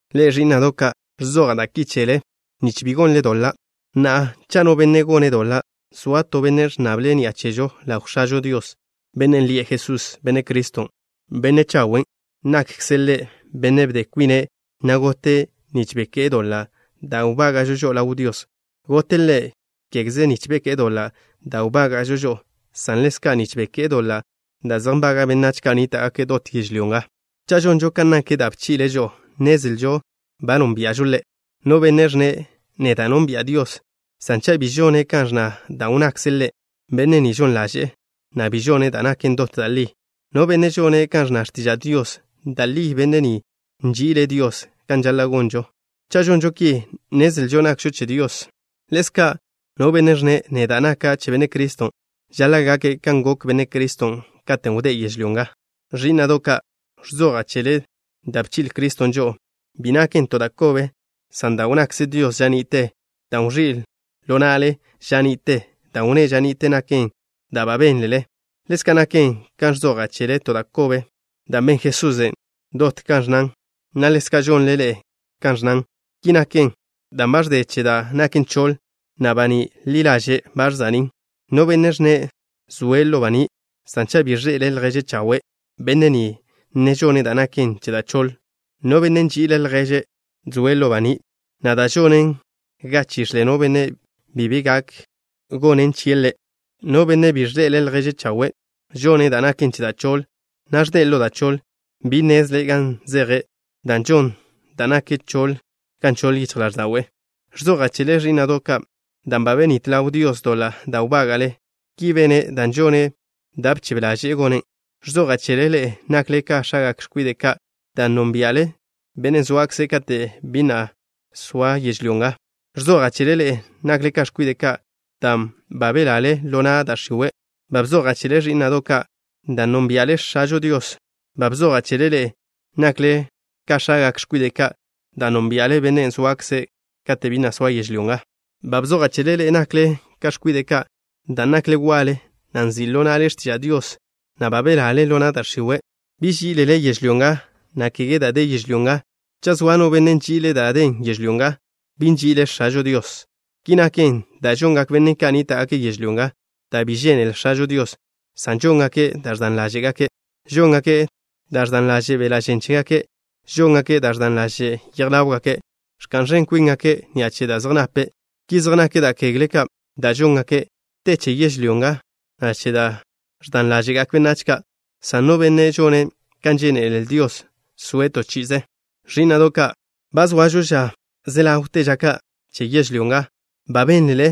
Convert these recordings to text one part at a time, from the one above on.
Ḻe'e, ẕí'na'do' ka', ẕzoja' da' ki chele, nich bi gonle doḻa'. Na'a, cha' no benne' gone' doḻa', zoa to Benne' ẕnnable' ni'a chežo ḻaw X̱ažo Dios, Bennen' lie' Jesús, Benne' Criston', Benne' chawen'. Nakkze' Ḻe' Bennen' bde kwine', na' gote' nich beké'e doḻa' da' wbága'žo žo'o ḻaw Dios. Gote' Ḻe', kégeze nich beké'e doḻa' da' wbága'žo žo'o, san ḻezka' nich beké'e doḻa' da' zej nbaga' benách ka' nníta'gake' dot yežlyó nga. Cha' žonžo kan nak da' bchi'le' žo'o, nnezlžo ba nónbia'žo Ḻe'. No benne' ẕnne': “Neda' nónbi'a Dios” san cha' bi žone' kan ẕnna da' wnnakze' Ḻe', benne' ni žon ḻaže'e, na' bi žone' da' naken dot da' li. No benne' žone' kan ẕnna x̱tiža' Dios, da' li benne' ni nži'ile' Dios kan žaḻa' gonžo. Cha' žonžo ki, nnezlžo nakžo che Dios. Ḻezka', no benne' ẕnne': “Neda' naka' che Benne' Criston'” žaḻa' gake' kan gok Benne' Criston' katen' wdé' yežlyó nga. Ẕí'na'do' ka', ẕzoja' chele da' bchi'le Criston' žo'o. Bi naken to da' kobe, san dan' wnnakze Dios ža ni'te, dan' wẕí' ḻo na'le ža ni'te. Dan' wnné' ža ni'te naken da' ba benl-le. Ḻezka' naken ka ẕzoja' chele to da' kobe, dan' ben Jesusen' dot kan ẕnnan, na' ḻezka' žonle ḻe'e kan ẕnnan. Ki naken dan' ba ẕde che da' naken choḻ, na' baní' li ḻaže' ba ẕza'nín'. No benne' ẕnne': “Zoa' ḻo baní'” san cha' bi ẕḻe'ele' lježe' chawe', benne' ni ne žone' da' naken che da' choḻ. No benne' nži'ile' lježe' zoe' ḻo baní', na' da' žonen ga chix̱le no benne' bi be gak gonen chie' ḻe'. No benne' bi de lježe' chawe', žone' da' naken che da' choḻ, na' ẕde' ḻo da' choḻ. Bi nnezle' gan zeje', dan' žon da' naken choḻ ga nchoḻ yichj ḻáẕda'we'. Ẕzoja' chele, ẕí'na'do' ka', dan' ba benít ḻaw Dios doḻa' da' wbága'le. Ki bene' dan' žone' da' bchebe ḻaže'e gonen'. Ẕzoja' chele, ḻe'e nakle ka x̱agak x̱kwide' ka', dan' nónbia'le Bennen' zoakze' kate' bi na' soa yežlyó. Ẕzoja' chele, ḻe'e nakle ka x̱kwide' ka', dan' ba belale ḻo na' da' x̱iwe'. Ba bzoja' chele, ẕí'na'do' ka', dan' nónbia'le X̱ažo Dios. Ba bzoja' chele ḻe'e, nakle ka x̱agak x̱kwide' ka', dan' nónbia'le Bennen' zoakze' kate' bi na' soa yežlyó. Ba bzoja' chele ḻe'e, nakle ka x̱kwide' ka', dan' nakle waḻe, na' nzi' ḻo na'le x̱tiža' Dios, na' ba belale ḻo na' da' x̱iwe'. Bi ží'ilele yežlyó nga, na' kege da' de yežlyó nga. Cha' zoa no benne' nži'ile' dan' den yežlyó nga, bi nži'ile' X̱ažo Dios. Ki naken, dan' žongak benne' ka' nníta'gake' yežlyó nga da' bi žénele X̱ažo Dios, san žóngake' da' ẕdan ḻáže'gake'. Žóngake' da' ẕdan ḻaže' beḻa' žen chégake'. Žóngake' da' ẕdan ḻaže' yej ḻáwgake'. Ẕka'n ẕen kwíngake' ni'a che da' zej nape'. Ki zej nak da' kegle ka' da' žóngake'. Te che yežlyó nga, na' che da' ẕdan ḻáže'gak benách ka', san no benne' žone' kan žénele Dios soe' to chi'ize. Ẕí'na'do' ka', ba zoažo ža ze ḻawte ža ka' che yežlyó nga. Ba bénlele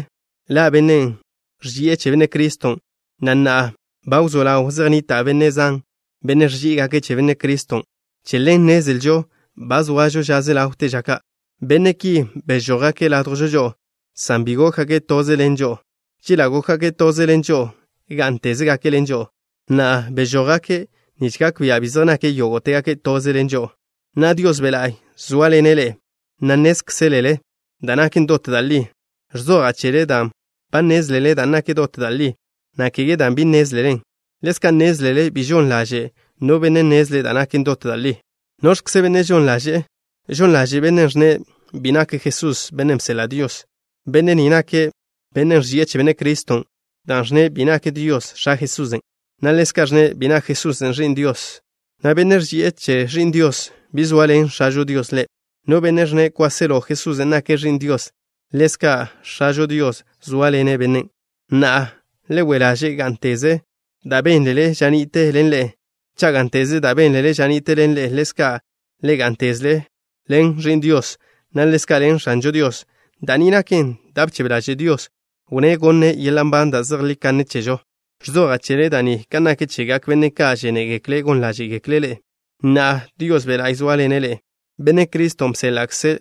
ḻa' bennen' ẕži'e che Benne' Criston', na' na'a ba wzó ḻaw zej nnita' benne' zan, benne' ẕží'igake' che Benne' Criston'. Che ḻen nnezlžo ba zoažo ža ze ḻawte ža ka'. Benne' ki bežójgake' ládjwžo žo'o, san bi gókgake' toze ḻen žo'o. Chela' gókgake' toze ḻen žo'o, gá'ntezgake' ḻen žo'o. Na'a, bežójgake', nich gak bia' bi zej nake' yógo'tegake' toze ḻen žo'o. Na'a, Dios Be' La'y zóaḻene' ḻe'e, na' nnézkzelele da' naken dot da' li. Ẕzoja' chele dan' ba nnézlele da' naken dot da' li, na' kege dan' bi nnézlelen. Ḻezka' nnézlele bi žon ḻaže' no benne' nnezle' da' naken dot da' li. ¿Noẕkze bennen' žon ḻaže'e? Žon ḻaže' bennen' ẕnne' bi nak Jesús Bennen' bseḻa' Dios. Benne' ni nake' bennen' ẕži'e che Benne' Criston', dan' ẕnne' bi nak Dios X̱a Jesusen', na' ḻezka' ẕnne' bi nak Jesusen' Ẕi'n Dios. No benne' ẕži'e che Ẕi'n Dios, bi zoaḻen X̱ažo Dios ḻe'. No benne' ẕnne' kwáselo Jesusen' nake' Ẕi'n Dios, ḻezka' X̱ažo Dios zóaḻene' bennen'. Na'a, le we' ḻaže' gá'nteze da' bénlele ža ni'te ḻen ḻe'e. Cha' gá'nteze da' bénlele ža ni'te ḻen ḻe'e, ḻezka' ḻe'e gá'ntezle ḻen Ẕi'n Dios, na' ḻezka' ḻen X̱ažo Dios. Da' ni naken da' bchebe ḻaže' Dios, wnné' gonne' yeḻa' nban da' zejlí kanne chežo. Ẕzoja' chele da' ni kan nak chegak benne' ka' žénegekle' gon ḻáže'gekle' ḻe'e. Na'a, Dios Be' La'y zóaḻene' ḻe'e. Benne' Criston' bséḻa'kze'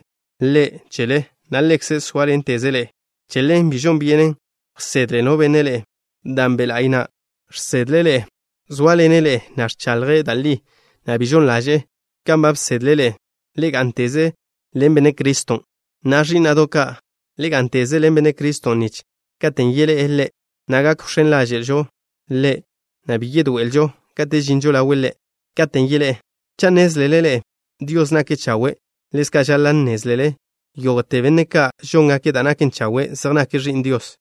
Ḻe' chele, na' Ḻekze' zóaḻenteze' ḻe'e. Che ḻen bi žon byenen wsedle no benne' ḻe'e, dan' Be' La'y na' žsedle' ḻe'e. Zóaḻene' ḻe'e, na' ẕchaḻje' da' li, na' bi žon ḻaže'e. Kan ba bsedle' ḻe'e, le gá'nteze ḻen Benne' Criston'. Na'a, ẕí'na'do' ka', le gá'nteze ḻen Benne' Criston' nich katen' yeḻé'e Ḻe', na' gak wx̱én ḻáže'žo Ḻe', na' bi yedoé'elžo kate' žinžo ḻawe' Ḻe' katen' yeḻé'e. Cha' nnézlele ḻe'e Dios nake' chawe', ḻezka' žaḻa' nnézlele yógo'te benne' ka' žóngake' da' naken chawe' zej nake' ẕi'n Dios.